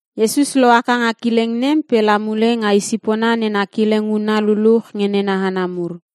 Iesus lohaka nga kileng nem pe la mule nga isipona na kileng huna luluch nge nena hana mur.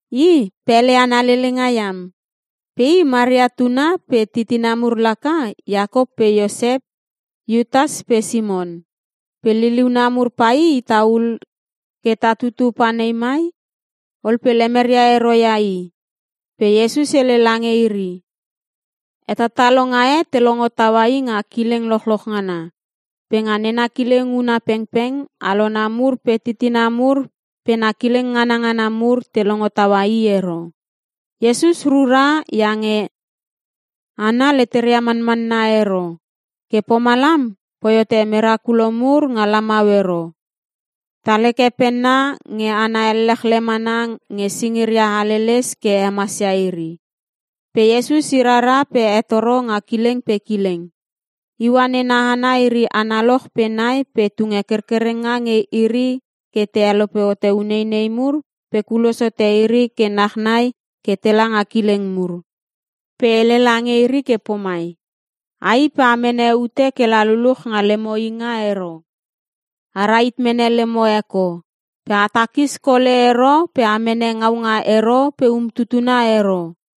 I pele ana lelenga iam! Pe i Maria tuna pe titina mur laka Iakop pe Iosep, Iutas pe Simon. Pe liliuna mur pai itaul ke ta tutu panei mai!” Ol pe lemeria ero ia i. Pe Iesus hele lange iri, “Hetalalonga e te longo taua i nga kileng lochloch ngana. Pe nga nena kileng huna pengpeng, alona mur pe titina mur pe na kileng ngana ngana mur te longo taua i ero.” Iesus rura iange hana leteria manmanna ero. Ke pomalam poi hote merakulo mur nga lamau ero. Tal heke penna nge hana ellechle mana nge singiria haleles ke hemasia iri. Pe Iesus i rara pe hetoro nga kileng pe kileng. Iua nena hana iri analoch pe nai pe tunge kerkerenga nge iri ke te helope hote uneinei mur pe kulos hote iri ke nachnai ke tela nga kileng mur. Pe hele lange iri ke pomai, “A i pe a mene ute kela luluch nga lemo inga ero. A rahit mene lemo eko. Pe a takis kole ero pe a mene ngaunga ero pe umtutuna ero.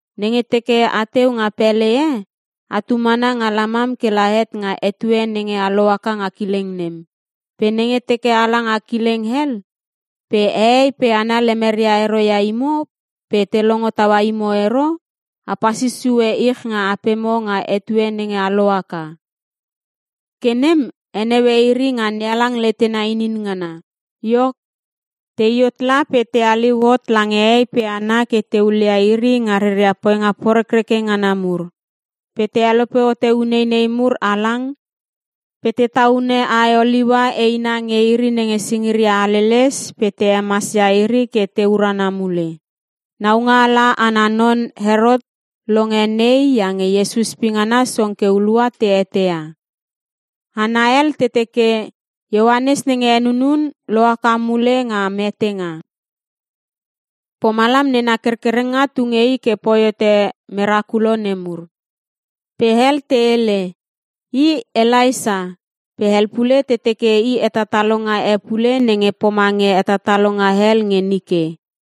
Nenge teke ateu nga pele e, atu mana nga lamam kela het nga etue nenge a lohaka nga kileng nem. Pe nenge teke ala nga kileng hel pe hehei pe hana lemeria ero ia imo pe te longo taua imo ero, a pasis sue ich nga apemo nga etue nenge a lohaka. Ke nem heneue iri nga NeHalang letena inin ngana.” Iok, tei hot la pe te haliu hot lange hehei pe hana ke te hulia iri nga reria poinga porekreke ngana mur. Pe te helope hote uneinei mur halang, pe te taune ae oliua eina nge iri nenge singiria haleles pe te hemasia iri ke te urana mule. Naungaala ana non Herot longe nei iange Iesus pingana song ke hulua te eteia. Hana hel te teke, “Ioanes nenge henunun lohaka mule nga metenga. Pomalam nena kerkerenga tu nge i ke poi hote ure merakulo nemur.” Pe hel te hele, “I Elaisa” pe hel pule te teke i hetatalonga e pule nenge pomange hetatalonga hel nge nike.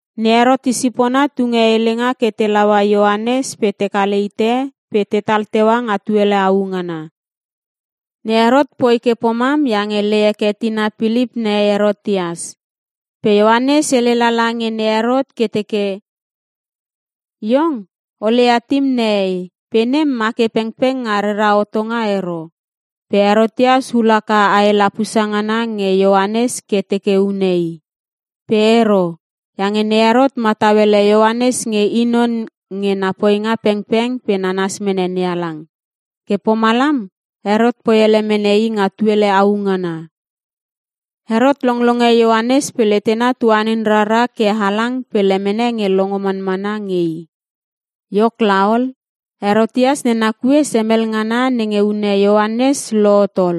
Ne Herot isipona tunge helenga ke te laua Ioanes pe te kale hite pe tetal teua nga tuele au ngana. Ne Herot poi ke pomam iange lei heke tina Pilip nehei Herotias, pe Ioanes hele lala nge ne Herot ke teke “Iong o leia tim nehei pe nem ma ke pengpeng nga rera hotonga ero.” Pe Herotias hul haka ae lapusa ngana nge Ioanes ke teke une i. Pe ero. Iange ne Herot matau ele Ioanes nge i non nge na poinga pengpeng pe nanas mene NeHalang. Ke pomalam Herot poi ele mene i nga tuele au ngana. Herot longlonge Ioanes pe letena tuanin rara halang pe lemene nge longo manmana nge i. Iok laol, Herotias nena kue semel ngana nenge hune Ioanes lohot ol.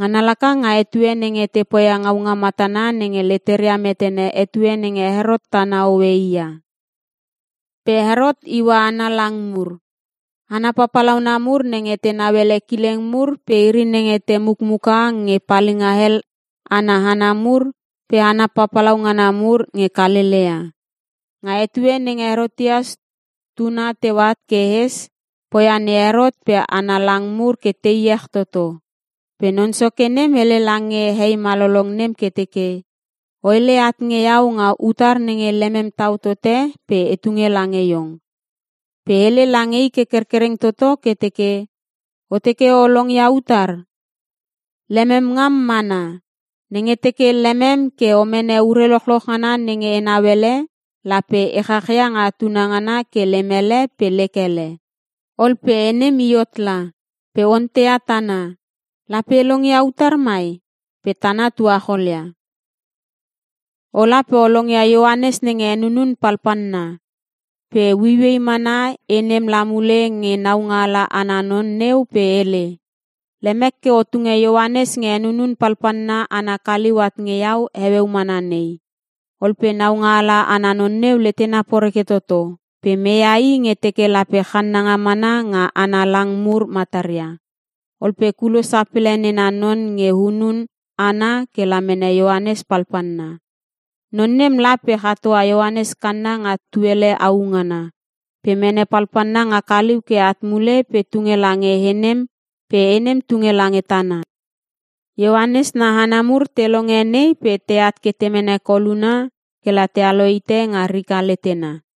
Ngana laka nga etue nenge te poia ngaunga matana nenge leteria metene etue nenge Herot tana hoe i ia. Pe Herot iua ana lang mur. Hana papalauna mur nenge te nauele kileng mur pe iri nenge te mukmuka nge palinga hel ana hana mur pe hana papalau ngana mur nge Kalelea. Nga etue nenge Herotias tuna teu at ke hes, poia ne Herot pe ana lang mur ke te iech toto. Pe non soke nem hele lange he malolong nem ke teke, “O hele at nge iau nga utar nenge lemem tau tote pe e tunge lange iong.” Pe hele lange i ke kerkereng toto ke teke, “O teke o longia utar? Lemem ngam mana! Nenge teke lemem ke o mene ure lochloch ngana nenge enau ele, lape e chachia nga tuna ngana ke lem hele pe lek hele.” Ol pe he nem i hot la, pe onteia tana, “Lape e longia utar mai?” Pe tana tuacholia, “Ola pe o longia Ioanes nenge henunun palpalna.” Pe ueiuei mana he nem la mule nge naungala ana non neu pe hele, “Lemek ke o tunge Ioanes nge henunun palpalna ana kaliu at nge iau heueu mana nei.” Ol pe naungaala ana non neu letena poreke toto, pe meia i nge teke lape channanga mana nga ana lang mur mataria. Ol pe kulos sapele nena non nge hunun hana kela mene Ioanes palpalna. Non nem la pe chatoa Ioanes kanna nga tuele au ngana. Pe mene palpalna nga kaliu ke at mule pe tunge lange he nem pe he nem tunge lange tana. Ioanes na hana mur te longe nei pe teat ke te mene koluna kela tealo hite nga rika letena.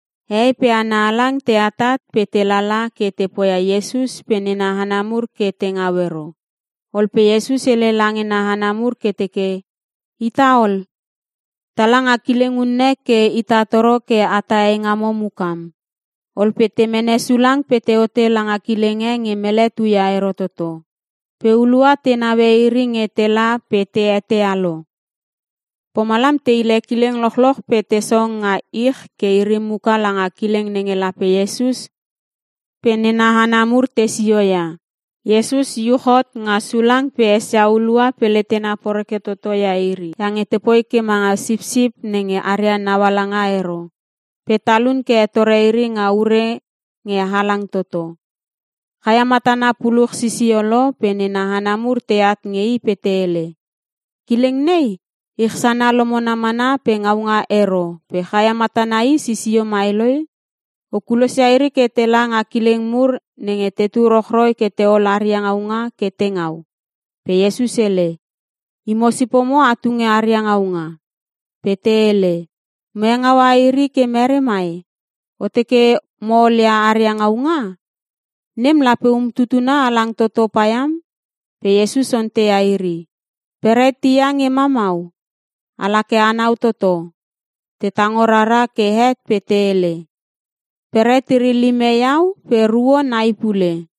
Hehei pe hana halang te atat pe te lala ke te poia Iesus pe nena hana mur ke te ngau ero. Ol pe Iesus hele lange na hana mur ke teke, “Ita ol, tala nga kileng unne ke ita toro ke a tah eingamo mukam.” Ol pe te mene sulang pe teote langa kileng e nge mele tuia ero toto. Pe hulua te neue iri nge tela pe te eteia lo. Pomalam te hile kileng lochloch pe te song nga ich ke iri muka langa kileng nenge lape Iesus pe nena hana mur tesio ia. Iesus iuch hot nga sulang pe esia hulua pe letena poreke toto ia iri iange tepoi ke manga sipsip nenge aria naualanga ero. Pe talun ke hetore iri nga ure nge halang toto. Chaia matana puluch sisio lo pe nena hana mur teat nge i pe te hele, “Kileng nei, ich sana lomona mana pe ngaunga ero pe chaia matana i sisio mai loi. O kulosia iri ke tela nga kileng mur nenge tetu rochroi ke teol aria ngaunga ke te ngau.” Pe Iesus hele, “Imo sipomo a tunge aria ngaunga.” Pe te hele, “Mo hengaua iri ke mere mai? O teke mo olia aria ngaunga? Nem lape umtutuna halang toto paiam!” Pe Iesus onteia iri, “Beret hia nge ma mau? Ala ke anau toto.” Te tango rara ke het pe te hele, “Beret iri lime iau pe ruo nai pule.”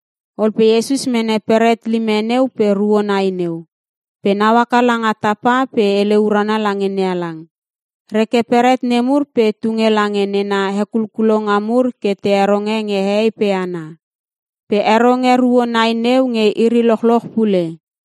Ol pe Iesus mene beret lime neu pe ruo nai neu. Pe nau haka langa tapa pe hele urana lange NeHalang. Reke beret nemur pe tunge lange nena hekulkulonga mur ke te heronge nge hehei pe hana. Pe heronge ruo nai neu nge iri lochloch pule.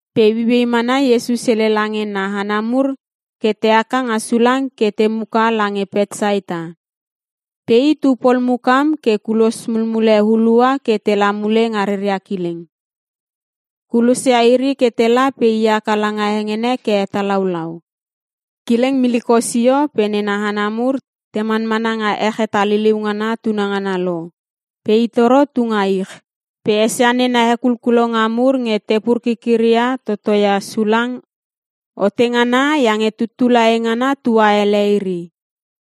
Pe ueiuei mana Iesus hele lange na hana mur ke te haka nga sulang ke te muka lange Petsaita. Pe i tu pol mukam ke kulos mulmule hulua ke tela mule nga reria kileng. Kulosia iri ke tela pe i haka langa hengene ke hetalaulau. Kileng miliko sio pe nena hana mur te manmana nga ech hetaliliu ngana tunangana lo pe i toro tu nga ich. Pe esia nena hekulkulonga mur nge te pur kikiria toto ia sulang ote ngana iange tuttula eingana tua ele iri.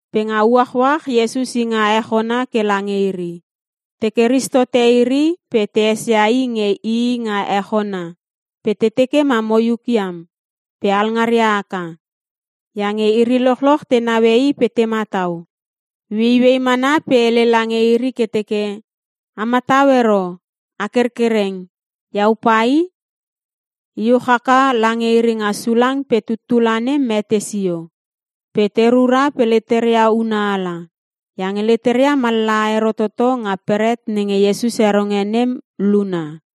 Pe nga uachuach Iesus i nga ech ona ke lange iri. Teke ris tote iri pe te esia i nge ii nga ech ona pe te teke ma moiuk iam pe alngaria haka. Iange iri lochloch tenaue i pe te matau. Ueiuei mana pe hele lange iri ke teke, “A matau ero! A kerkereng, Iau pa i!” Iuch haka lange iri nga sulang pe tuttula nem mete sio. Pe te rura pe leteria una ala, iange leteria mallaha ero toto nga beret nenge Iesus heronge nem luna.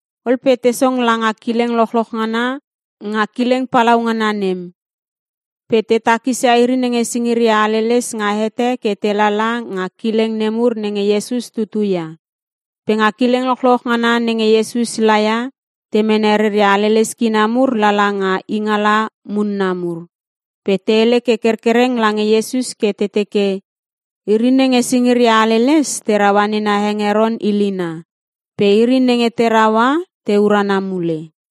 Ol pe te song langa kileng lochloch ngana nga kileng palaungana nem. Pe te takisia iri nenge singiria haleles nga hete ke te lala nga kileng nemur nenge Iesus tutu ia. Pe nga kileng lochloch ngana nenge Iesus laia, te mene reria haleles kina mur lala nga ingaala munna mur. Pe te hele kerkereng lange Iesus ke te teke iri nenge singiria haleles te raua nena hengeron ilina. Pe iri nenge te raua te urana mule.